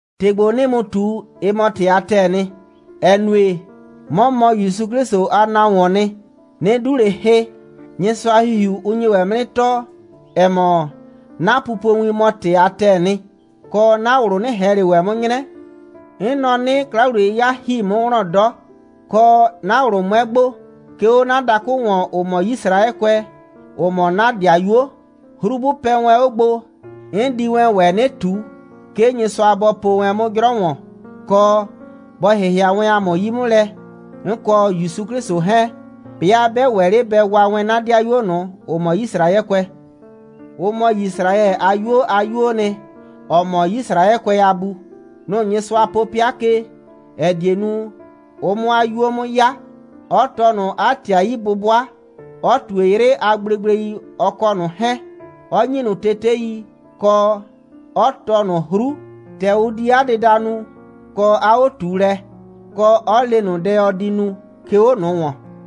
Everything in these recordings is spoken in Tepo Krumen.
‑Tɩ ‑gbo, 'nɩɩ mu ꞊tu, ɩ mɔ ‑tɩ a ‑tɛɛ nɩ, ‑ɛ nue, 'mɔ mɔ ‑Yusu 'Klɩsʋ a nahuoon nɩ, 'nɩ 'du ꞊le hɩ. Nyɩsʋa a ‑Hihiu, ʋ nye ‑wɛ 'mʋ 'nɩ tɔɔ, ‑ɛ mɔ, 'na pupowin mɔ ‑tɩ a ‑tɛɛ nɩ, kɔ, 'na ꞊wlʋ 'nɩ ꞊hɛn ꞊le ‑wɛ 'mʋ 'nyrɛ. 'N nɔ 'nɩ, 'kla‑wliye'yɩya ‑hi 'mʋ wlɔn 'dɔ, kɔ, 'na ꞊wlʋ 'mʋɛ gbo, 'ke 'o 'na dakʋ ‑wɔn, ‑ʋ mɔ Yisraɛkʋɛ, ‑ʋ mɔ 'na ‑dɩayuo. 'Hru 'bʋ pɛ wɛn 'o gbo, 'n di wɛn ‑wɛ 'nɩ ꞊tu, 'ke Nyɩsʋa bɔ po wɛn 'mʋ 'jrɔ ‑wɔn, kɔ, bɔ ‑hɩhɩa wɛn ‑a mʋ 'yi 'mʋ lɛ, 'n kɔ ‑Yusu 'Klɩsʋ 'hɛɛn, 'bɩa 'bɛ ‑wɛ 'le bɛ waa wɛn 'na ‑dɩayuo ꞊nʋ, ‑ʋ mɔ Yisraɛkʋɛ. Ʋ mɔ Yisraɛ a 'yuo a 'yuoo nɩ, ‑ɔ mɔ Yisraɛkʋɛ a bu. Nʋ‑ Nyɩsʋa po 'pɩa ke, ‑ɛ die nu, ʋ 'mʋ 'a 'yuo 'mʋ 'ya, 'ɔ tɔɔ ꞊nʋ 'a ‑tɩ a 'yi'bʋbʋa, 'ɔ ꞊tue 'yrɩ a gblegblei, ɔ kɔ ꞊nʋ 'hɛɛn, 'ɔ ‑nyi ꞊nʋ tetei, kɔ, 'ɔ tɔɔ ꞊nʋ 'hru, ‑tɛ ʋ di 'a dɩda nu kɔ 'a 'o꞊tuulɛ, kɔ, 'ɔ le ꞊nʋ dɛ, ɔ di nu, 'ke 'o ꞊nʋ ‑wɔn.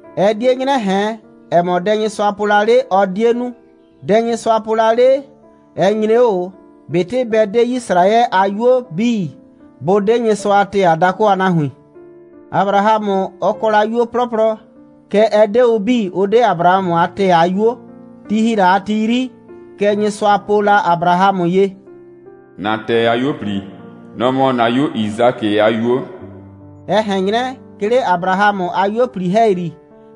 Ɛ 'die 'nyrɛ ꞊hɛn, ‑ɛ mɔ, dɛ Nyɩsʋa po la 'le, ɔ 'die nu. Dɛ Nyɩsʋa po la 'le, ɛ nyre 'o ꞊o, ꞊betɩ bɛ 'de Yisraɛ a 'yuo 'bii, bʋ 'de Nyɩsʋa a ‑tɛɛ a dakʋ a nahuin. Abrahamʋ, ɔ kɔ la 'yuo 'plɔplɔ, kɛɛ, ɛ 'de ʋ 'bii, ʋ 'de Abrahamʋ a ‑tɛɛ a 'yuo. Ti ‑hi la a ti 'yri, kɛ Nyɩsʋa po la Abrahamʋ ye: «‑Na ‑tɛɛ a 'yuo꞊pli, nʋ‑ mɔ ‑na 'yu Yisakɩ a 'yuo.» Ɛ ꞊hɛn 'nyrɛ, 'ke 'le Abrahamʋ a 'yuo꞊pli ‑hɛyri,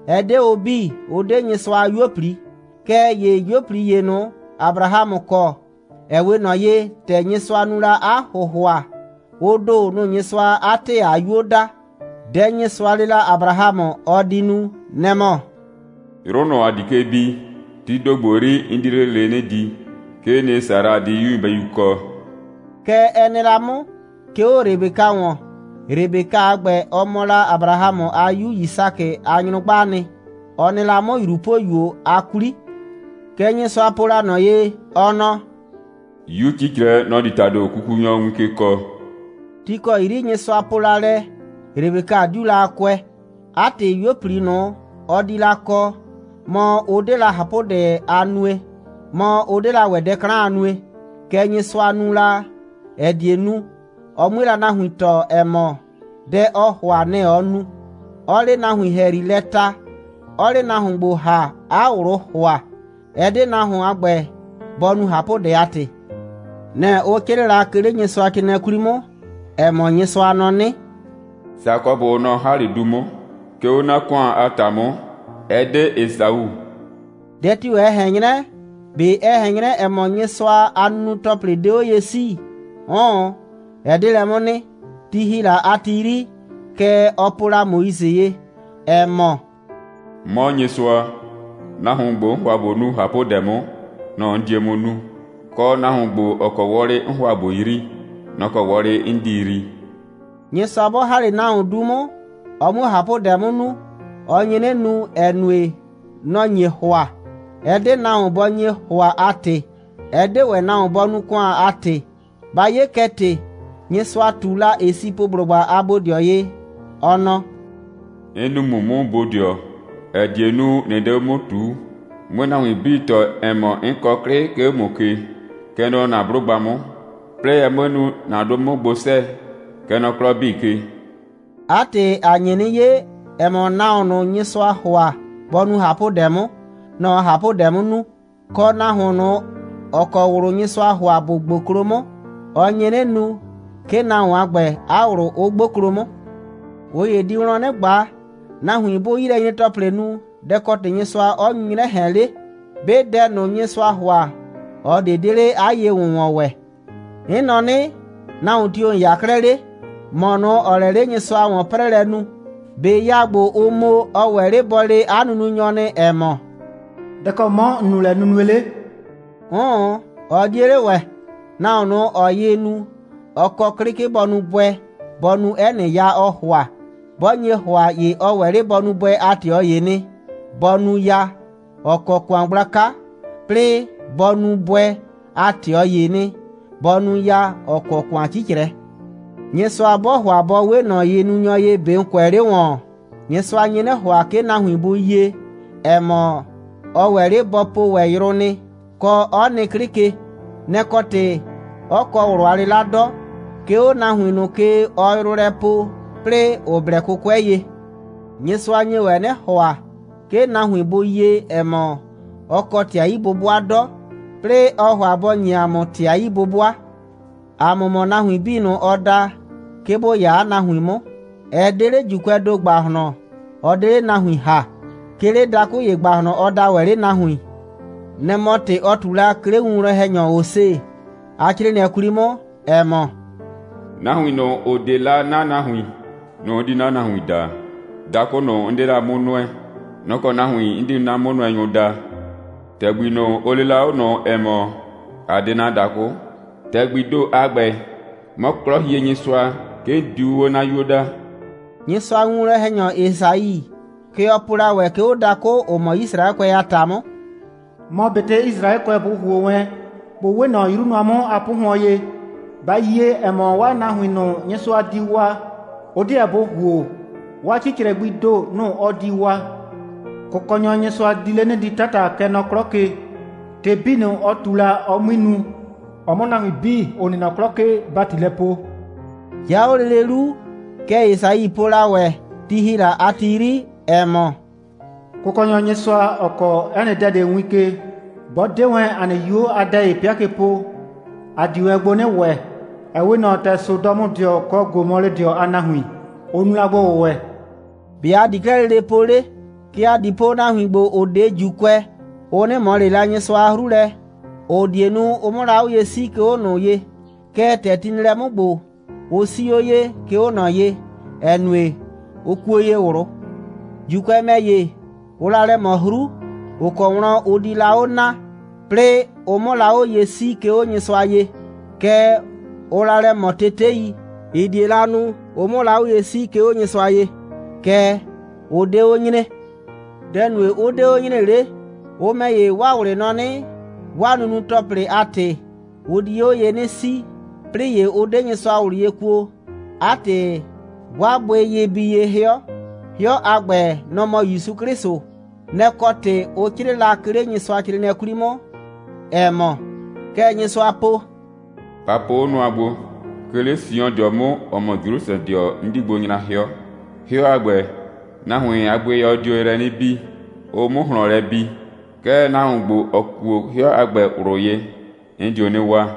ɛ 'de ʋ 'bii, ʋ 'de Nyɩsʋa a 'yuo꞊pli. Kɛɛ ‑ye 'yuo꞊pli ꞊nʋ, Abrahamʋ kɔ, ‑ɛ 'we ꞊nɔ ye, ‑tɛ Nyɩsʋa nu la 'a ‑hʋhʋa, ʋ ‑do, nʋ‑ Nyɩsʋaa 'a ‑tɛɛ a 'yuo daa. Dɛ Nyɩsʋa le la Abrahamʋ, ɔ di nu, nɛ‑ mɔ: «'Yrʋ ꞊nʋ, ‑a di ke bi, tii ‑do ‑gbo 'yri, 'n di 'le lele 'nɩ di. 'Kee nɩ, Sara di 'yu nyɩbɛyu kɔ.» Kɛ ɛ nɩ la 'mʋ, 'ke 'o Rebeka ‑wɔn. Rebeka a ‑gbɛ, ɔ mɔ la Abrahamʋ a 'yu Yisakɩ a nyrʋgbaa nɩ. Ɔ nɩ la 'mʋ ꞊yrupoyuo a 'kwli. Kɛ Nyɩsʋa po la ꞊nɔ ye, ɔ nɔ: «'Yu 'cicrɛ, nɔ‑ di ‑tado kukunyɔ win ke kɔɔ.» Ti ‑kɔ 'yri Nyɩsʋa po la lɛ, Rebeka 'diu la a kʋɛ. 'A ‑tɩ, 'yuo꞊pli ꞊nʋ, ɔ di la kɔ, mɔ, ʋ 'de la ꞊hapʋdɛ a nue, mɔ, ʋ 'de la ‑wɛ dɛ 'klan a nue. Kɛ Nyɩsʋa nu la, ‑ɛ die nu, ɔ 'mue nahuin tɔɔ, ‑ɛ mɔ, dɛ ɔɔ ‑hʋa, nɛ‑ ɔɔ nu, 'ɔɔ 'le nahuin ‑hɛyri lɛ ta, 'ɔɔ 'le nahuon ‑gbo ‑ha, 'a ꞊wlʋʋ ‑hʋa. Ɛ 'de nahuon a ‑gbɛ, bɔ nu ꞊hapʋdɛ a ‑tɩ. Nɛ‑ ʋ 'crɩɩ la, 'ke 'le Nyɩsʋacrɩɩnɩɛ 'kwli 'mʋ, ‑ɛ mɔ, Nyɩsʋa nɔ 'nɩ: «Sakɔbʋ, nɔ‑ 'n ‑ha 'le du 'mʋ, 'ke 'o 'na ‑kʋan a ‑ta 'mʋ, ɛ 'de Esau.» Dɛ tio‑ ɛ ꞊hɛn 'nyrɛ? ꞊Be ɛ ꞊hɛn 'nyrɛ, ‑ɛ mɔ, Nyɩsʋa a nunu‑tɔplɩ 'de 'o ye 'sii? 'Ʋʋn, ɛ 'de lɛ 'mʋ nɩ. Ti ‑hi la a ti 'yri, kɛ ɔ po la Moise ye, ‑ɛ mɔ: «'Mɔ Nyɩsʋa, nahuon ‑gbo, 'n ‑hʋa ꞊bo nu ꞊hapʋdɛ 'mʋ, nɔ‑ 'n die 'mʋ nu, kɔ, nahuon ‑gbo, ‑ɔ kɔ wɔlɩ 'n ‑hʋa ꞊bo yrii, nɔ‑ kɔ wɔlɩ 'n di yrii.» Nyɩsʋa 'bɔ ‑ha 'le nahuon du 'mʋ, ɔ 'muo ꞊hapʋdɛ 'mʋ nu, ɔ nye 'nɩ nu, ‑ɛ nue, nɔ‑ nye ‑hʋa, ɛ 'de nahuon bɔ nye ‑hʋa a ‑tɩ, ɛ 'de ‑wɛ nahuon bɔ nu ‑kʋan a ‑tɩ. Ba 'ye kɛ ‑tɩ, Nyɩsʋa ꞊tu la Esipʋblʋgba a bodɩɔ ye, ɔ nɔ: «'N nuu ‑mʋ 'mʋ bodɩɔ, ‑ɛ die nu, ꞊nɩ 'de 'o 'mʋ ꞊tuu, 'mue nahuin 'bii tɔɔ, ‑ɛ mɔ, 'n kɔ 'klɩ, 'ke 'o ‑mʋ ke, kɛ nɔ ‑na 'blʋgba 'mʋ, 'plɩɩ ɛ 'mue nu, 'na 'dʋ 'mʋ gbo 'sɛɛ, kɛ nɔ 'klɔ 'bii ke.» 'A ‑tɩ, ‑a nye 'nɩ 'ye, ‑ɛ mɔ, nahuon ꞊nʋ, Nyɩsʋaa ‑hʋa bɔ nu ꞊hapʋdɛ 'mʋ, nɔ‑ ɔɔ ꞊hapʋdɛ 'mʋ nu, kɔ, nahuon ꞊nʋ, ‑ɔ kɔ ꞊wlʋ Nyɩsʋaa ‑hʋa bʋ 'gboklo 'mʋ, ɔ nye 'nɩ nu, 'ke nahuon a ‑gbɛ a ꞊wlʋ 'ʋ 'gboklo 'mʋ. ꞊Ʋ ‑ye di wlɔn 'nɩ ꞊gba: Nahuin 'bʋʋ 'yilɛnyre‑tɔplɩ nu, dɛ‑ kɔ ‑tɩ Nyɩsʋa 'ɔ nyu 'nyrɛ ꞊hɛn 'le? 'Be dɛ ꞊nʋ, Nyɩsʋaa ‑hʋa, ꞊ɔ ꞊de 'de 'le 'a ye‑wʋnwɔn ‑wɛ. 'N nɔ 'nɩ: Nahuon tio‑ ‑n 'ya 'klɛɛ 'le, ‑mɔ ꞊nʋ, ‑ɔɔ lɛ 'le Nyɩsʋa a ‑wɔn'prɛɛlɛ nu? ꞊Be ya ‑gbo, ʋ mo, ɔ wɛ 'le bɔ le 'a nununyɔ nɩ, ‑ɛ mɔ: «Dɛ‑ kɔ 'mɔ ‑n nu lɛ nunue 'le?» 'Ʋʋn, ɔ 'die 'le ‑wɛ. Nahuon ꞊nʋ, ‑ɔɔ yɩ nu, ɔ kɔ 'klɩ, 'ke bɔ nu bʋɛ, bɔ nu 'ɛ nɩ ya, ɔɔ ‑hʋa. 'Bɔ nye ‑hʋa, ‑ye ɔ ‑wɛ 'le bɔ nu bʋɛ a ꞊tɩɔ ‑ye nɩ, bɔ nu ya, ‑ɔ kɔ ‑kʋan gblaka, 'plɩɩ bɔ nu bʋɛ a ꞊tɩɔ ‑ye nɩ, bɔ nu ya, ‑ɔ kɔ ‑kʋan 'cicrɛ. Nyɩsʋa 'bɔɔ ‑hʋa bɔ 'we ꞊nɔ yɩnunyɔ ye, ꞊be ‑n kʋɛ 'le ‑wɔn? Nyɩsʋa nye 'nɩ ‑hʋa, 'ke nahuin bʋ yie, ‑ɛ mɔ, ɔ ‑wɛ 'le bɔ po ‑wɛ yrʋ nɩ, kɔ, 'ɔ nɩ 'klɩ ke. Nɛ‑ kɔ ‑tɩ, 'ɔ kɔ ꞊wlʋ a 'lɩla 'dɔ, 'ke 'o nahuin ꞊nʋ ke, ɔɔ yrʋ lɛ poo, 'plɩɩ ‑ʋ blɛ 'kʋkʋɛ ye. Nyɩsʋa nye ‑wɛ 'nɩ ‑hʋa, 'ke nahuin bʋ yie, ‑ɛ mɔ, ɔ kɔ ‑tɩ a 'yi'bʋbʋa 'dɔ, 'plɩɩ ɔɔ ‑hʋa bɔ ‑nye ‑a mʋ ‑tɩ a 'yi'bʋbʋa. ‑A mʋ mɔ nahuin 'bii ꞊nʋ, ɔ da, 'ke bʋ 'ya 'a nahuin 'mʋ. Ɛ 'de 'le ‑Juukʋɛɛ ‑do ‑gbahlɔn, ɔ 'de 'le nahuin ‑ha. 'Ke 'le dakʋ ‑ye ‑gbahlɔn, ɔ daa ‑wɛ 'le nahuin. Nɛ‑ mɔ ‑tɩ, ɔ ꞊tu la, 'ke 'le winwlɔn‑hɛnyɔ Hose a 'crɩɩnɩɛ 'kwli 'mʋ, ‑ɛ mɔ: «Nahuin ꞊nʋ, ‑ʋ 'de la 'na nahuin, nʋ‑ 'n di 'na nahuin daa. Dakʋ ꞊nʋ, 'n 'de la 'mʋ nʋɛ, nʋ‑ kɔ nahuin 'n di 'na 'mʋnʋɛnyʋ daa. ‑Tɛgbi ꞊nʋ, ʋ lee la 'o ꞊nʋ, ‑ɛ mɔ: A 'de 'na dakʋ, ‑tɛgbii ‑do a ‑gbɛ, 'mɔ 'Klɔhienyɩsʋa, 'ke 'n diu 'o 'na 'yuo daa.» Nyɩsʋa a winwlɔn‑hɛnyɔ Esai, kɛ ɔ po la ‑wɛ, 'ke 'o dakʋ, ‑ʋ mɔ Yisraɛkʋɛ a ‑ta 'mʋ: «Mɔ ꞊betɩ Yisraɛkʋɛ bʋ ‑huo wɛn, bʋ 'we ꞊nɔ 'yru nʋa 'mʋ a 'pʋhʋɔn ye, ba yie, ‑ɛ mɔ, 'waa nahuin ꞊nʋ, Nyɩsʋa di waa, ʋ 'deɛ bʋ ‑huo, 'waa 'cicrɛ gbii ‑do, nʋ‑ ɔ di waa. Kʋkɔnyɔ Nyɩsʋa di 'le 'nɩ di 'tata, kɛ nɔ 'klɔ ke, ‑tɩ 'bii ꞊nʋ, ɔ ꞊tu la, ɔ 'mui nu, ɔ 'mʋ nahuin 'bii, ‑ʋ nɩ nɔ 'klɔ ke ‑bati lɛ poo.» 'Ya 'o lele 'lu, kɛ Esai po la ‑wɛ, ti ‑hi la a ti 'yri, ‑ɛ mɔ: «Kʋkɔnyɔ Nyɩsʋa, ‑ɔ kɔɔ 'ɛ nɩ dɛ ꞊de win ke, 'bɔ 'de wɛn ‑a nɩ 'yuo a dɛ ‑ye 'pɩa ke po, ‑a di wɛn gbo 'nɩ ‑wɛ, ‑ɛ 'we ꞊nɔ ‑tɛ Sodɔmʋdɩɔ kɔ Gomɔlɩdɩɔ a nahuin, ʋ nu la gbo‑wʋwɛ.» ‑Be' ‑a di 'klɛɛ lele po 'le? Kɛ ‑a di po, nahuin ‑gbo, ‑ʋ 'de ‑Juukʋɛ, ʋ 'nɩ ꞊mɔ ꞊le la Nyɩsʋa a 'hru lɛ, ‑ʋ die nu, ʋ 'mʋ la 'o ye 'sii, 'ke 'o ꞊nɔ ye. Kɛɛ, ‑tɛ ti nɩ lɛ 'mʋ ‑gbo, ʋ 'sii 'o ye, 'ke 'o ꞊nɔ ye, ‑ɛ nue, ʋ kuo ye ꞊wlʋ. ‑Juukʋɛ ‑mɛ ‑ye, ʋʋ la lɛ ꞊mɔ 'hru, ‑ʋ kɔ wlɔn ʋ di la 'o naa, 'plɩɩ ʋ 'mʋ la 'o ye 'sii, 'ke 'o Nyɩsʋa ye. Kɛɛ, ʋʋ la lɛ ꞊mɔ tetei, ‑ɩ die la nu, ʋ 'mʋ la 'o ye 'sii, 'ke 'o Nyɩsʋa ye, Kɛɛ, ʋ 'de 'o nyre. Dɛ‑ nue, 'ʋ 'de 'o nyre 'le? Ʋ ‑mɛ ‑ye, 'waa ꞊wlɩ nɔ 'nɩ, 'waa nunu‑tɔplɩ a ‑tɩ, ʋ di 'o ye 'nɩ 'sii, 'plɩɩ ‑ye, ʋ 'de Nyɩsʋa ꞊wlʋ ye kuo. 'A ‑tɩ, 'waa bʋɩyɩ bi ye 'hɩɔ. 'Hɩɔ a ‑gbɛ, nɔ‑ mɔ ‑Yusu 'Klɩsʋ. Nɛ‑ kɔ ‑tɩ ʋ 'crɩɩ la, 'ke 'le Nyɩsʋacrɩɩnɩɛ 'kwli 'mʋ, ‑ɛ mɔ: «Kɛ Nyɩsʋa po: Ba po 'o nʋa gbo! 'Ke 'le Siondɩɔ 'mʋ, ‑ɔ mɔ Jrusrɛdɩɔ, 'n di gbo nyra 'hɩɔ. 'Hɩɔ a ‑gbɛ, nahuin a bʋɩyɔ di 'o yrɛ 'nɩ bi, ʋ 'mʋ ꞊hlɔn lɛ bi. Kɛɛ, nahuon ‑gbo, ‑ɔ kuo 'hɩɔ a ‑gbɛ ꞊wlʋ ye, 'n dio 'nɩ waa.»